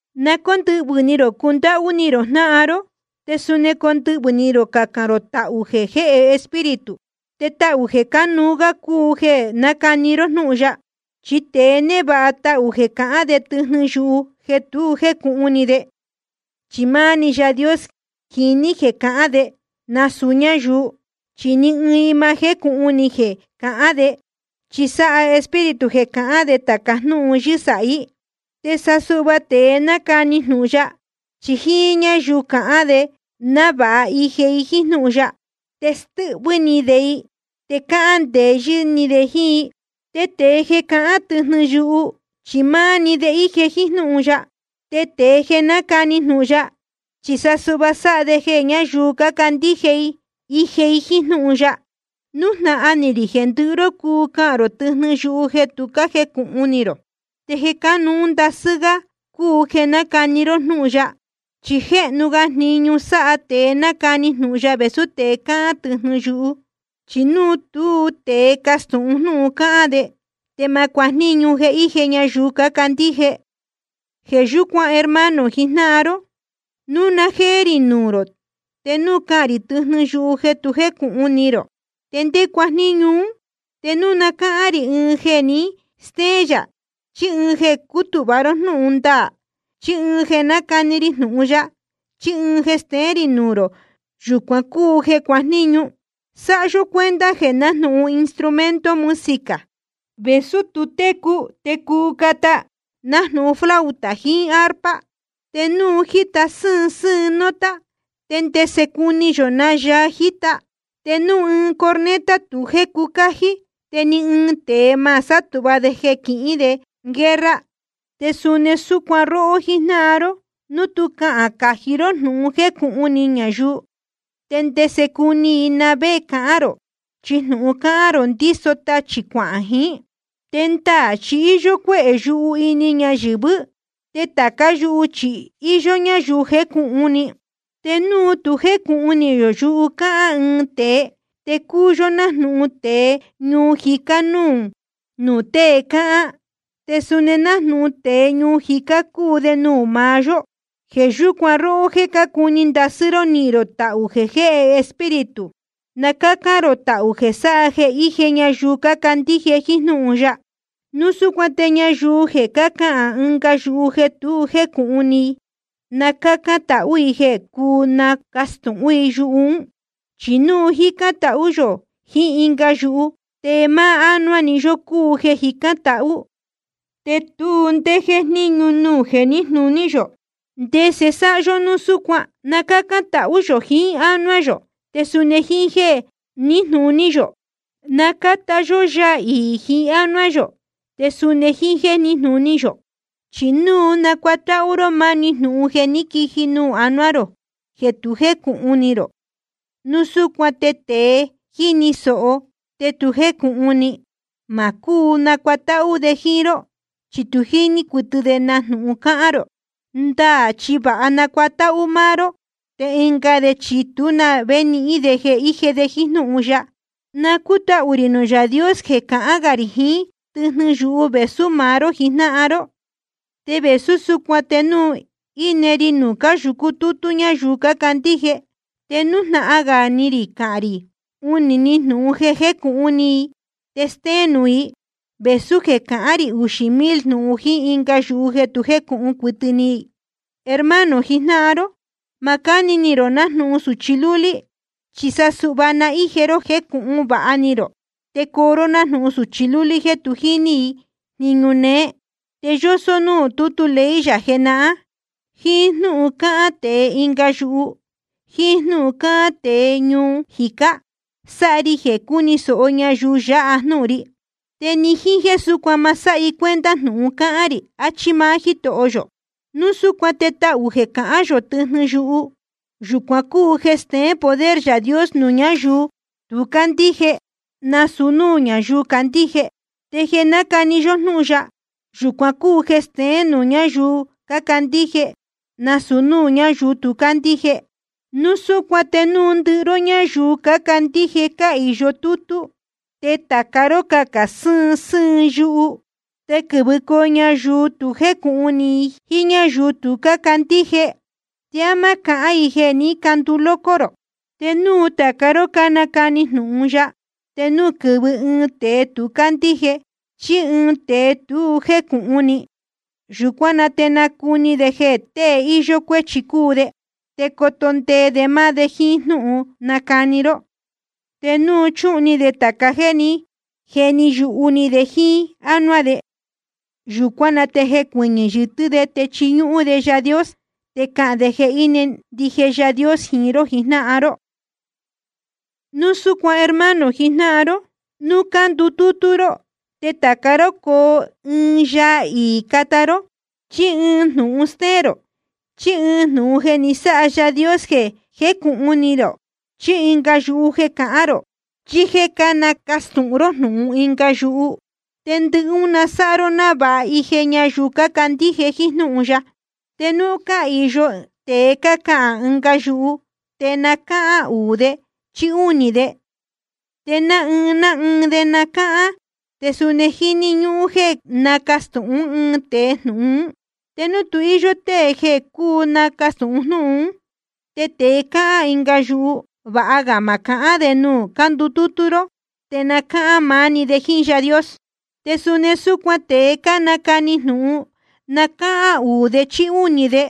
Na cóndɨhvɨ̄ ni rō cundáhú ni rō jnáhan ró, te suni condɨhvɨ̄ ni rō cacān rō tāca táhū jeē jéhe Espíritu. Te tahū jeē cánuú gá cúu jeē nácani ró jnúhun ya. Chi tēe névāha tahū jeē cahán de tɨjnɨ yuhu jeē tu jécūhun ni de, chi máá‑ni Yaā Dios jiní jeē cahán de, nasūu ñáyuu. Chi ni ɨɨn i ma jécūhun ni jeē cahán de. Chi sáha Espíritu jeē cahán de tāca jnúhun yɨ́sāhí. Te sa suhva tēe nácani jnūhun ya, chi jíín ñáyuu cahán de návāha ije i jíín jnúhun ya, te stɨ́hvɨ́ ni de i, te cáhán ndeyɨ́ ni de jíín i. Te tēe jeē cahán tɨjnɨ yuhu, chi máá‑ni de íje jíín jnúhun ya. Te tēe jeē nácani jnūhun ya, chi sa suhva sáha de jeē ñáyuu cácandíje íje i jíín jnúhun ya. Nújnahan ni rī jeē ndɨhɨ ró cuu cahān rō tɨjnɨ yuhu jeē tu jécūhun ni rō, te jeē cánuú ndasɨ́ gá cúu jeē nácani ró jnúhun ya. Chi jéhnu ga jniñu sáha tēe nácani jnūhun ya vēsú tēe cáhán tɨjnɨ yuhu. Chi núu tú tēe castūhun jnúhun cáhán de, te ma cuajníñu jeē íje ñayuu cácandíje. Jeē yúcuan hermano jijnáhan ró, núu na jéé rī nuū rō, te núu cahān rī tɨjnɨ yuhu jeē tu jécūhun ni rō, ¿te ndé cuajníñu ún? Te núu na cáhán rī ɨɨn jeē ni stéén yā, chí ɨɨn jeē cútūhva ró jnúhun ndaā, chí ɨɨn jeē nácani ri jnūhun ya, chí ɨɨn jeē steén rī nuū rō, yūcuan cúu jeē cuajníñu. Sáha yó cuenta jeē nájnūhun instrumento música, vēsú tu técu, te cuu cata, nájnūhun flauta jiín arpa. Te núu tu jíta sɨ́ɨn sɨ́ɨn nota, ¿te ndese cuni yō na yaa jíta? Te núu corneta tu jécu cájí, te ni ɨɨn tēe ma sátūhva de quihīn de guerra. Te suni súcuan róhó jíjnáhan ró, núu tu cáhán cají ró jnūhun jecūhun ni ñayuu, ¿te ndese cuni i na vé cahán rō? Chi jnūhun cáhán rō ndíso tachī cuahān jiín. Te ndaā chi íyó cuéhē yuhu ini ñayɨ̄vɨ́, te tācá yuhu chi íyó ñáyuu jécūhun ni. Te núu tu jécūhun ni yō yuhu cáhán ɨɨn tēe, te cúu yó nájnūhun tēe ñuu jicá núū tēe cáhán, te suni nájnūhun tēe ñuu jicá cúu de nuū maá yó. Jeē yúcuan róhó jéē cácuni ndasɨ́ ró nihīn rō tahū jeē jéhe Espíritu, na cácán rō tahū jeē sáha jeē íje ñayuu cácandíje jíín jnúhun ya. Núu súcuan te ñayuu jeē cahán ɨnga yuhu jeē tu jécūhun ni i, na cácán tahú i jeē cuu nacastūhún i yuhu ún. Chi núu jícán tahú yō jiín ɨnga yuhu, te máá ánuá‑ni yó cúu jeē jicán tahú, te tu ndé jéjníñu nuū jeē níjnūní yō. ¿Ndese sáha yó núu súcuan? Na cácán tahú yō jiín ánuá yō, te suni jíín jéē níjnūní yō. Na cáta yó yaa iī jiín ánuá yō, te suni jíín jéē níjnūní yō. Chi núu nácuatáhú ró máni jnūhun jeē ní quiji nuū anuá rō te tu jécūhun ni rō, núu súcuan te tēe jíni sōho te tu jécūhun ni, ma cúu nacuatáhú de jíín ró. Chi tu jíní cuɨtɨ de na jnūhun cáhán rō. Ndaā chi vāha nácuatáhú máá ró, te ɨnga de chi tú na vé nihín de jeē íje de jíín jnúhun ya. Na cútahū rī nuū Yaā Dios jeē cahán gā rī jiín tɨjnɨ yuhu vēsú maá ró jijnáhan ró. Te vēsú súcuan te núu íne ri nuū cáyūcu tútú ñáyuu cácandíje, te nújnahan gā ni rī cahān rī uhūn‑ni jnūhun jeē jécūhun ni i te stéén nuū i, vēsú jeē cahán rī uxī mil jnūhun jíín ɨnga yuhu jeē tu jíní cuɨtɨ i. Hermano jijnáhan ró, ma cáni ni rō nájnūhun sūchi lúlí, chi sa suhva na íje ró jéē jecūhun vāha ni rō. Te coo ró nájnūhun sūchi lúlí jéē tu jíní i jniñu néé. Te yósó núū tútu ley yā jenahán: Jíín jnúhun cácahān tēe ɨnga yuhu, jíín jnúhun cácahān tēe ñuu jicá, sáha ri jeē cúni sōho ñayuu yáha jnúhun ri. Te ni jíín súcuan ma sáha i cuenta jnūhun cahān rī, achí máá Jítoho yō. Núu súcuan te tahū jeē cahán yō tɨjnɨ yuhu, yūcuan cúu ɨɨn jeē steén poder Yaā Dios nuū ñáyuu tu cácandíje, nasūu núū ñáyuu cácandíje. Te jeē nácani yó jnúhun ya, yūcuan cúu jeē steén nuū ñáyuu cácandíje, nasūu núū ñáyuu tu cácandíje. Núu súcuan te núu ndɨhɨ ró ñáyuu cácandíje cáhīyo tútú, te tāca ró cácahān sɨ́ɨn sɨ́ɨn yuhu, te quɨ̄vɨcoo ñayuu tu jécūhun ni jiín ñáyuu tu cándíje, ¿te á má cahán i jeē ní canduu loco rō? Te núu tāca ró cánacani jnūhun ya, te núu quɨ̄vɨ ɨɨn tēe tu cándíje chí ɨɨn tēe tu jécūhun ni, yūcuán na te nacuni de jeē tée íyó cuéchi cúu de, te coto ndee de máá de jíín jnúhun cánacani ró. Te nucūhun ni de tāca jéē ní jeni yuhu ni de jíín ánuá de. Yūcuán na te jecuɨñɨ̄ yɨtɨ́ de te chiñúhún de Yaā Dios. Te cahān de jeē íne ndije Yaā Dios jiín ró jijnáhan ró. Núu súcuan hermano jijnáhan ró: Nuū cándutútú ró te tāca ró coo ɨɨn yaa iī cata ró, chí ɨɨn jnūhun stéén rō, chí ɨɨn jnūhun jeē ni sáha Yaā Dios jeē jécūhun ni rō, chí ɨnga yuhu jeē cahán rō, chí jéē nácastūhun ró jnūhun ɨnga yuhu ún. Te ndɨhɨ ún na sáha ró návāha ije ñayuu cácandíje jíín jnúhun ya. Te núu cáhīyo tēe cahān ɨnga yuhu, te na cáhán uū de chí únī‑ni de, te ná ɨɨn ná ɨɨn de na cáhán. Te suni jíni ñúhún jéē nacastūhún ɨɨn tēe jnūhun ún. Te núu tu íyó tée jeē cúu nacastūhun jnúhun ún, te tēe cácahān ɨnga yuhu, vāha ga ma cahán de nuū cándutútú ró, te na cáhán maá‑ni de jíín Yaā Dios. Te suni súcuan tēe cánacani jnūhun, na cáhán uū de chí únī de,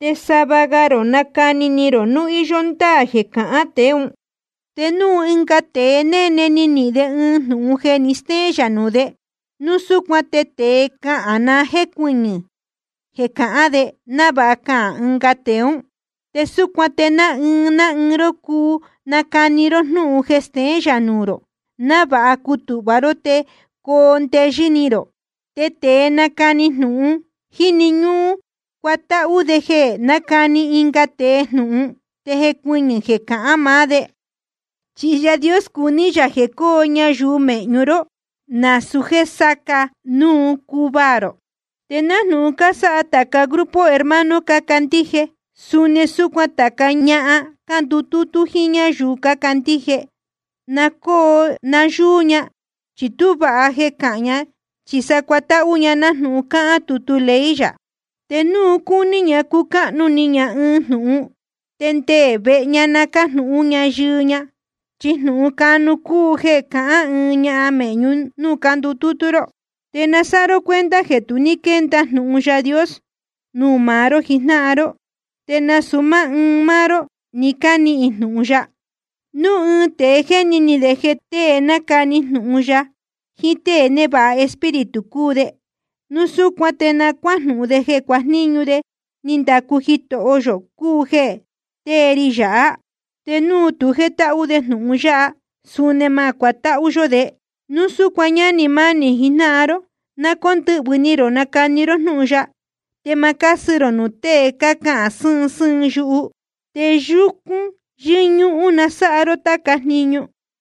te sava ga rō nacani ni rō núu íyó ndáā jeē cácahān tēe ún. Te núu ɨnga tēe néne ni nihīn de ɨɨn jnūhun jeē ni stéén yā nuū de, núu súcuan te tēe cáhán na jécuɨñɨ̄ jeē cahán de, návāha cahān ɨnga tēe ún. Te súcuan te ná ɨɨn ná ɨɨn ró cuu nacani ró jnúhun jeē steén yā nuū rō, návāha cutūhva ró te coo ndeyɨ́ ni rō. Te tēe cánacani jnūhun, jíni ñúhún cuatáhú de jeē nácani ɨnga tēe jnūhun te jecuɨñɨ̄ jeē cahán maá de. Chi Yaā Dios cuní yā jeē coo nayúú méhñu ró, násūu jéē sacā núu cuvaā rō. Te nájnūhun cásáha tāca grupo hermano cácandíje, suni súcuan tācá ñahan cándutútú jíín ñáyuu cácandíje, na cóo nayúú ña. Chi tú vāha jeē cahán ña, chi sa cuatáhú ña nájnūhun cáhán tutu ley yā. Te núu cúní ña cucáhnu ni ña ɨɨn jnūhun, te nde vehe na cájnūhún ña yɨɨ ña. Chi jnūhun canu cúu jeē cahán ɨɨn ñahan mēhñu núū cándutútú ró. Te na sáha ró cuenta jeē tu ní quénda jnūhun Yaā Dios nuū maá ró jijnáhan ró, te nasūu máá ɨɨn máá ró ní cánihīn jnūhun ya. Núu ɨɨn tēe jéni ni de jeē tée nácani jnūhun ya jiín tée névāha Espíritu cúu de, núu súcuan te na cuájnúhún de jeē jniñu ní ndacu Jitoho yō cúu jeē tée ri yāhá. Te núu tu jétáhú de jnūhun yáha, suni ma cuatáhú yó de. Núu súcuan, ñánī mánī jijnáhan ró, na cóndɨhvɨ̄ ni rō nacani ró jnúhun ya, te ma cásɨ rō nuū tée cácahān sɨ́ɨn sɨ́ɨn yuhu. Te yúcún yɨ́ñúhún na sáha ró táca jniñu.